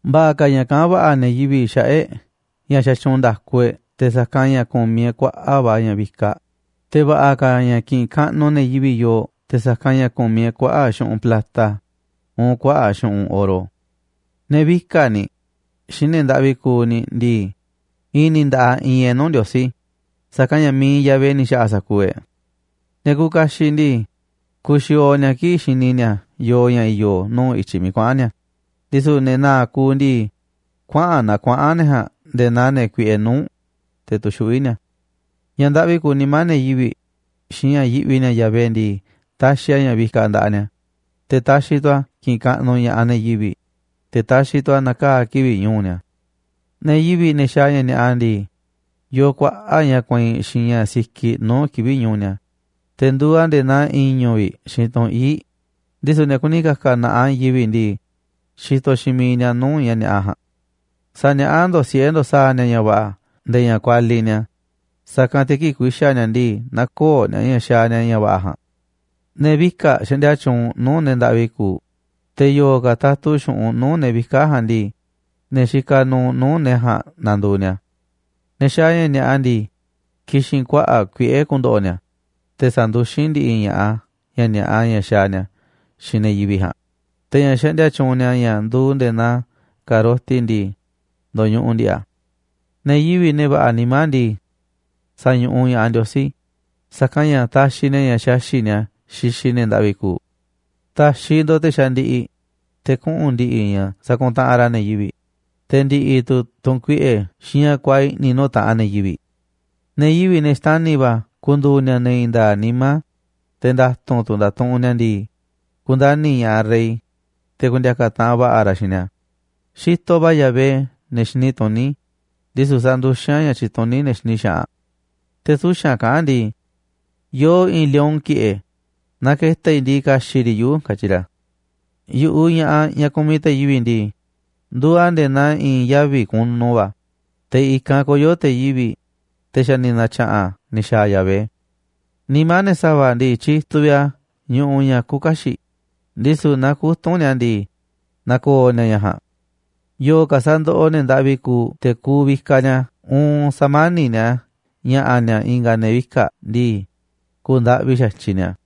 Va̱ꞌa̱ ka̱ ña̱ kaꞌán va̱ꞌa̱ ne̱ yivi̱ꞌ xaꞌa̱ꞌ e̱ꞌ ña̱ xatyuunꞌ nda̱ku e̱ꞌ te̱ sa̱kanꞌ ña̱ ku̱miꞌ e̱ꞌ kuaꞌa̱ꞌ va̱ ña̱ vikaꞌ, te̱ va̱ꞌa̱ ka̱ ña̱ kiꞌinꞌ kaꞌnuꞌ ne̱ yivi̱ꞌ yooꞌ te̱ sa̱kanꞌ ña̱ ku̱miꞌ e̱ꞌ kuaꞌa̱ꞌ xu̱ꞌunꞌ plata, uun kuaꞌa̱ꞌ xu̱ꞌunꞌ oro. Ne̱ vika̱ꞌ ni̱, xiinꞌ ne̱ ndaꞌvi kuuꞌ ni̱ ndii, i̱i̱n ni̱ nda̱ꞌaꞌ iinꞌ e̱ꞌ nuu̱ꞌ Ndiosí, sa̱kanꞌ ña̱ mi̱iꞌ Yahvé ni̱ xa̱ꞌa̱ sa̱kuuꞌ e̱ꞌ. Ne̱ kuuꞌ kaxiꞌ ndii, kuuꞌ xiooꞌ ni̱a̱ kii̱ꞌ xini ni̱a̱ yooꞌ ña̱ i̱yo̱ nuu̱ꞌ i̱tyiꞌ miiꞌ kuaꞌa̱n ni̱a̱, ndisu̱ ne̱ na̱a̱ꞌ kuuꞌ ndii, kuaꞌa̱n naa kuaꞌa̱n ne̱ ja̱a̱nꞌ nde̱e̱ naa ne̱ kuiꞌe nuu̱ꞌ, te̱ tuxuꞌví ni̱a̱. Ña̱ ndaꞌvi kuuꞌ nimá ne̱ yivi̱ꞌ xiinꞌ ña̱ yiꞌvi ni̱a̱ Yahvé ndii, taxiꞌ a̱ ña̱ vikaꞌ nda̱ꞌaꞌ ni̱a̱, te̱ taxiꞌ tu̱ a̱ kiꞌinꞌ kaꞌnuꞌ ña̱ꞌaꞌ ne̱ yivi̱ꞌ, te̱ taxiꞌ tu̱ a̱ na̱kaa̱ kivi̱ꞌ ñu̱u̱ ni̱a̱. Ne̱ yivi̱ꞌ, ne̱ xaaꞌ ña̱ ni̱a̱ꞌa ndii, yoo kuaꞌa̱ꞌ ña̱ kueinꞌ xiinꞌ ña̱ sikiꞌ nuu̱ꞌ kivi̱ꞌ ñu̱u̱ ni̱a̱, te̱ nduuꞌ a̱ nde̱e̱ naa i̱ñu̱ vi̱ꞌ xiinꞌ tunꞌ íiꞌ, ndisu̱ ne̱ kuni ka̱ka̱ na̱ꞌaꞌ i̱i̱n yivi̱ꞌ ndii, xitoꞌ xiinꞌ miiꞌ ni̱a̱ nuu̱ꞌ ña̱ ni̱a̱ꞌa ja̱a̱nꞌ. Sa̱niaꞌá ndo̱ꞌ siꞌe̱ ndo̱ꞌ sa̱a̱ ni̱a̱ ña̱ va̱ꞌa̱ nde̱e̱ ña̱ kualiꞌ ni̱a̱, sa̱kanꞌ te̱ kii̱ꞌ ku̱i̱xa̱ ni̱a̱ ndii, nä̱ko̱o̱ ni̱a̱ ña̱ xaaꞌ ni̱a̱ ña̱ va̱ꞌa̱ ja̱a̱nꞌ. Ne̱ vika̱ꞌ xaꞌndia tyuunꞌ nuu̱ꞌ ne̱ ndaꞌvi kuuꞌ, te̱ yo̱o̱ ka̱ tatu xu̱ꞌunꞌ nuu̱ꞌ ne̱ vika̱ꞌ ja̱a̱nꞌ ndii, ne̱ xikaꞌ nuuꞌ nuu̱ꞌ ne̱ ja̱a̱nꞌ nanduuꞌ ni̱a̱. Ne̱ xaaꞌ ña̱ ni̱a̱ꞌa ndii, ki̱xi̱n kuaꞌa̱ꞌ kuiꞌe̱ ku̱ndo̱ꞌo̱ ni̱a̱, te̱ sa̱nduxín ndi̱ꞌi̱ ña̱ꞌaꞌ ña̱ ni̱a̱ꞌa ña̱ xaaꞌ ni̱a̱ xiinꞌ ne̱ yivi̱ꞌ ja̱a̱nꞌ, te̱ ña̱ xandia tyuunꞌ ni̱a̱ ña̱ nduuꞌ nde̱e̱ naa ka̱roti ndii, ndo̱ñuꞌuꞌ ndi̱ꞌi̱ a̱. Ne̱ yivi̱ꞌ, ne̱ va̱ꞌa̱ nimá ndii, sa̱ñuꞌuꞌ ña̱ꞌaꞌ Ndiosí, sa̱kanꞌ ña̱ taxiꞌ ni̱a̱ ña̱ xaxi̱ꞌ ni̱a̱ xixiꞌ ne̱ ndaꞌvi kuuꞌ. Ta̱xiꞌ ndo̱ꞌ te̱ xandiꞌiꞌ, te̱ kuꞌu̱n ndi̱ꞌi̱ ña̱ sakuntaꞌanꞌ ra̱ ne̱ yivi̱ꞌ, te̱ ndi̱ꞌi̱ tu̱ tu̱nkuiꞌe̱ xiinꞌ ña̱ kuaaꞌ i̱ꞌni̱ nuu̱ꞌ taꞌanꞌ ne̱ yivi̱ꞌ. Ne̱ yivi̱ꞌ, ne̱ xtani̱ va̱ ku̱ndu̱u̱ ni̱a̱ ne̱ i̱i̱n nda̱a̱ꞌ nimá, te̱ nda̱tu̱nꞌ tu̱ ndatuꞌunꞌ ni̱a̱ ndii, ku̱ndani̱ ña̱ꞌaꞌ rey, te̱ ku̱ndi̱a̱ka̱ taꞌanꞌ va̱ꞌa̱ ra̱ xiinꞌ ni̱a̱. Xitoꞌ va̱ Yahvé ne̱ xini tuní, ndisu̱ sanduxín a̱ ña̱ tyituní ne̱ xini xaꞌanꞌ. Te̱ suxa̱nꞌ kaꞌán ndii: “Yoo i̱i̱n lion ki̱ꞌe̱, naaꞌ ke̱ta̱ i̱ ndii, ka̱xi̱ꞌ riꞌ yuꞌu̱”, katyi ra̱. Yu̱ꞌuꞌ ña̱ꞌaꞌ, ñaꞌ kumiꞌ te̱ yivi̱ꞌ ndii, nduuꞌ a̱ nde̱e̱ naa i̱i̱n yavi̱ kunu va̱, te̱ i̱kanꞌ koyo̱ te̱ yivi̱ꞌ, te̱ xa̱ ni̱ na̱tya̱ꞌa̱n ni̱ xa̱a̱ Yahvé. Nimá ne̱ sa̱va̱ ndii, tyituꞌ vi̱ꞌ a̱ ñuꞌuꞌ ña̱ küuꞌ kaxiꞌ, ndisu̱ naaꞌ kutu̱nꞌ ni̱a̱ ndii, na̱ko̱o̱ ni̱a̱ ña̱ ja̱a̱nꞌ. Yo̱o̱ ka̱ sa̱ndoꞌoꞌ ne̱ ndaꞌvi kuuꞌ te̱ ku̱u̱ vikaꞌ ni̱a̱, uun sa̱mani̱ꞌ ni̱a̱ ña̱ꞌa̱ ni̱a̱ i̱nga̱ ne̱ vika̱ꞌ ndii, ku̱u̱ ndaꞌvi xa̱tyiꞌ ni̱a̱.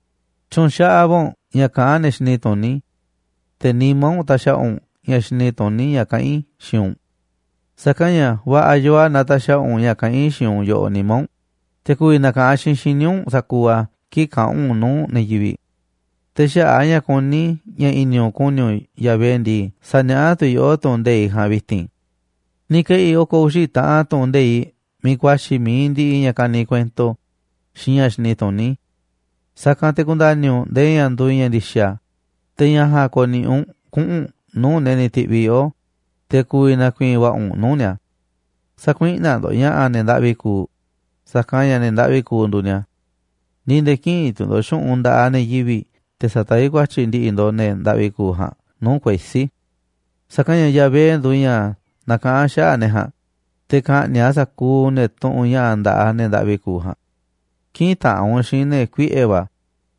Tyu̱nxaꞌaꞌ va̱ u̱nꞌ ña̱ kaꞌán ne̱ xini tuní, te̱ nimá u̱nꞌ ta̱xa̱ꞌa̱ u̱nꞌ ña̱ xini tuní ña̱ kaꞌán i̱ xiinꞌ u̱nꞌ. Sa̱kanꞌ ña̱ va̱ꞌa̱ yoo a̱ naaꞌ ta̱xa̱ꞌa̱ u̱nꞌ ña̱ kaꞌán i̱ xiinꞌ u̱nꞌ yoꞌoꞌ nimá u̱nꞌ, te̱ ku̱vi̱ na̱ka̱ꞌanꞌ xiinꞌ xíniꞌ u̱nꞌ sa̱kuuꞌ a̱ kii̱ꞌ kaꞌa̱n u̱nꞌ u̱n nuu̱ꞌ ne̱ yivi̱ꞌ. Te̱ xaꞌa̱ꞌ a̱ ña̱ kuní i̱ ña̱ i̱ni̱ u̱nꞌ ku̱ni̱ u̱nꞌ Yahvé ndii, sa̱niaꞌá tu̱ i̱ yoꞌó tu̱ꞌu̱n nde̱iꞌ ja̱a̱nꞌ vi̱ti̱n. Ni̱ ke̱ꞌi̱ i̱ oko̱ uxi̱ taꞌan tu̱ꞌu̱n nde̱iꞌ miiꞌ ku̱a̱xi̱ mi̱iꞌ ndiꞌiꞌ ña̱ kaniꞌ kuento xiinꞌ ña̱ xini tuní. Sa̱kanꞌ te̱ ku̱nda̱ni̱ u̱nꞌ ndee ña̱ nduuꞌ ña̱ ndi̱xa̱, te̱ ña̱ ja̱a̱nꞌ ko̱ni̱ꞌi̱ u̱nꞌ kuꞌu̱n u̱nꞌ nuu̱ꞌ ne̱ ni̱ ti̱ꞌviꞌ yoꞌó, te̱ ku̱vi̱ na̱ku̱i̱i̱n va̱ꞌa̱ u̱nꞌ nuu̱ꞌ ni̱a̱. Sä̱kuiꞌnaꞌ ndo̱ꞌ ña̱ꞌa̱ ne̱ ndaꞌvi kuuꞌ, sa̱kanꞌ ña̱ ne̱ ndaꞌvi kuuꞌ nduuꞌ ni̱a̱. Ni̱ nde̱e̱ kï̱ꞌi̱n tu̱ ndo̱ꞌ xu̱ꞌunꞌ nda̱ꞌaꞌ ne̱ yivi̱ꞌ te̱ sa̱taví ku̱a̱tyi̱ ndi̱ꞌi̱ ndo̱ꞌ ne̱ ndaꞌvi kuuꞌ ja̱a̱nꞌ nuu̱ꞌ kuesí. Sa̱kanꞌ ña̱ Yahvé nduuꞌ ña̱ nakaꞌán xaꞌa̱ꞌ ne̱ ja̱a̱nꞌ, te̱ ka̱ꞌni̱ꞌ a̱ sa̱kuuꞌ ne̱ tuꞌunꞌ ña̱ꞌa̱ nda̱ꞌaꞌ ne̱ ndaꞌvi kuuꞌ ja̱a̱nꞌ. Kï̱ꞌi̱n taꞌanꞌ u̱nꞌ xiinꞌ ne̱ kuiꞌe̱ va̱,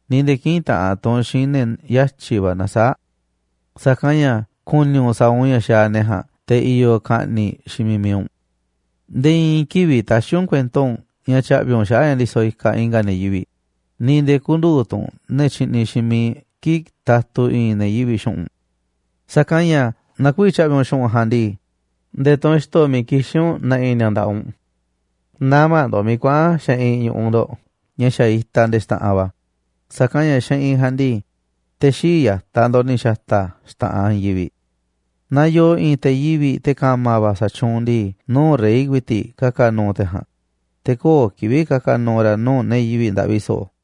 ni̱ nde̱e̱ kï̱ꞌi̱n taꞌanꞌ tu̱ u̱nꞌ xiinꞌ ne̱ yatyi̱ va̱ nasaáꞌ. Sa̱kanꞌ ña̱ ku̱ni̱ u̱nꞌ sa̱a̱ u̱nꞌ ña̱ xaaꞌ ne̱ ja̱a̱nꞌ, te̱ i̱yo̱ ka̱ꞌni̱ꞌ xiinꞌ miiꞌ mi̱iꞌ u̱nꞌ. Nde̱e̱ i̱i̱n kivi̱ꞌ tä̱xi̱ u̱nꞌ kuento u̱nꞌ ña̱ tya̱ꞌvi̱ u̱nꞌ xaꞌa̱ꞌ ña̱ ndisoꞌ ikaꞌ i̱nga̱ ne̱ yivi̱ꞌ, ni̱ nde̱e̱ kü̱ndu̱u̱ tu̱ u̱nꞌ ne̱ tyiꞌniꞌ xiinꞌ miiꞌ kii̱ꞌ tatu i̱i̱n ne̱ yivi̱ꞌ xu̱ꞌunꞌ. Sa̱kanꞌ ña̱ naaꞌ kü̱vi̱ tya̱ꞌvi̱ u̱nꞌ xu̱ꞌunꞌ ja̱a̱nꞌ ndii, nde̱e̱ tunꞌ xto̱ miiꞌ kixín u̱nꞌ na̱ꞌi̱ ni̱a̱ nda̱ꞌaꞌ u̱nꞌ. Nä̱ma̱ ndo̱ꞌ miiꞌ kuaꞌa̱n xeꞌinꞌ ñu̱ꞌuꞌ ndo̱ꞌ ña̱ xa̱ itaꞌ nde̱e̱ xta̱ꞌanꞌ va̱, sa̱kanꞌ ña̱ xeꞌinꞌ ja̱a̱nꞌ ndii, te̱ xii̱ꞌ ya̱taꞌ ndo̱ꞌ ni̱ xa̱ta̱ a̱ xta̱ꞌanꞌ i̱i̱n yivi̱ꞌ. Naaꞌ yoo i̱i̱n te̱ yivi̱ꞌ, te̱ ka̱ma̱ va̱ sa̱tyuunꞌ ndii, nuu̱ꞌ rey ku̱i̱ti̱ꞌ ka̱ka̱ nu̱u̱ te̱ ja̱a̱nꞌ, te̱ köo̱ꞌ kivi̱ꞌ ka̱ka̱ nu̱u̱ ra̱ nuu̱ꞌ ne̱ yivi̱ꞌ ndaꞌvi so̱ꞌo̱.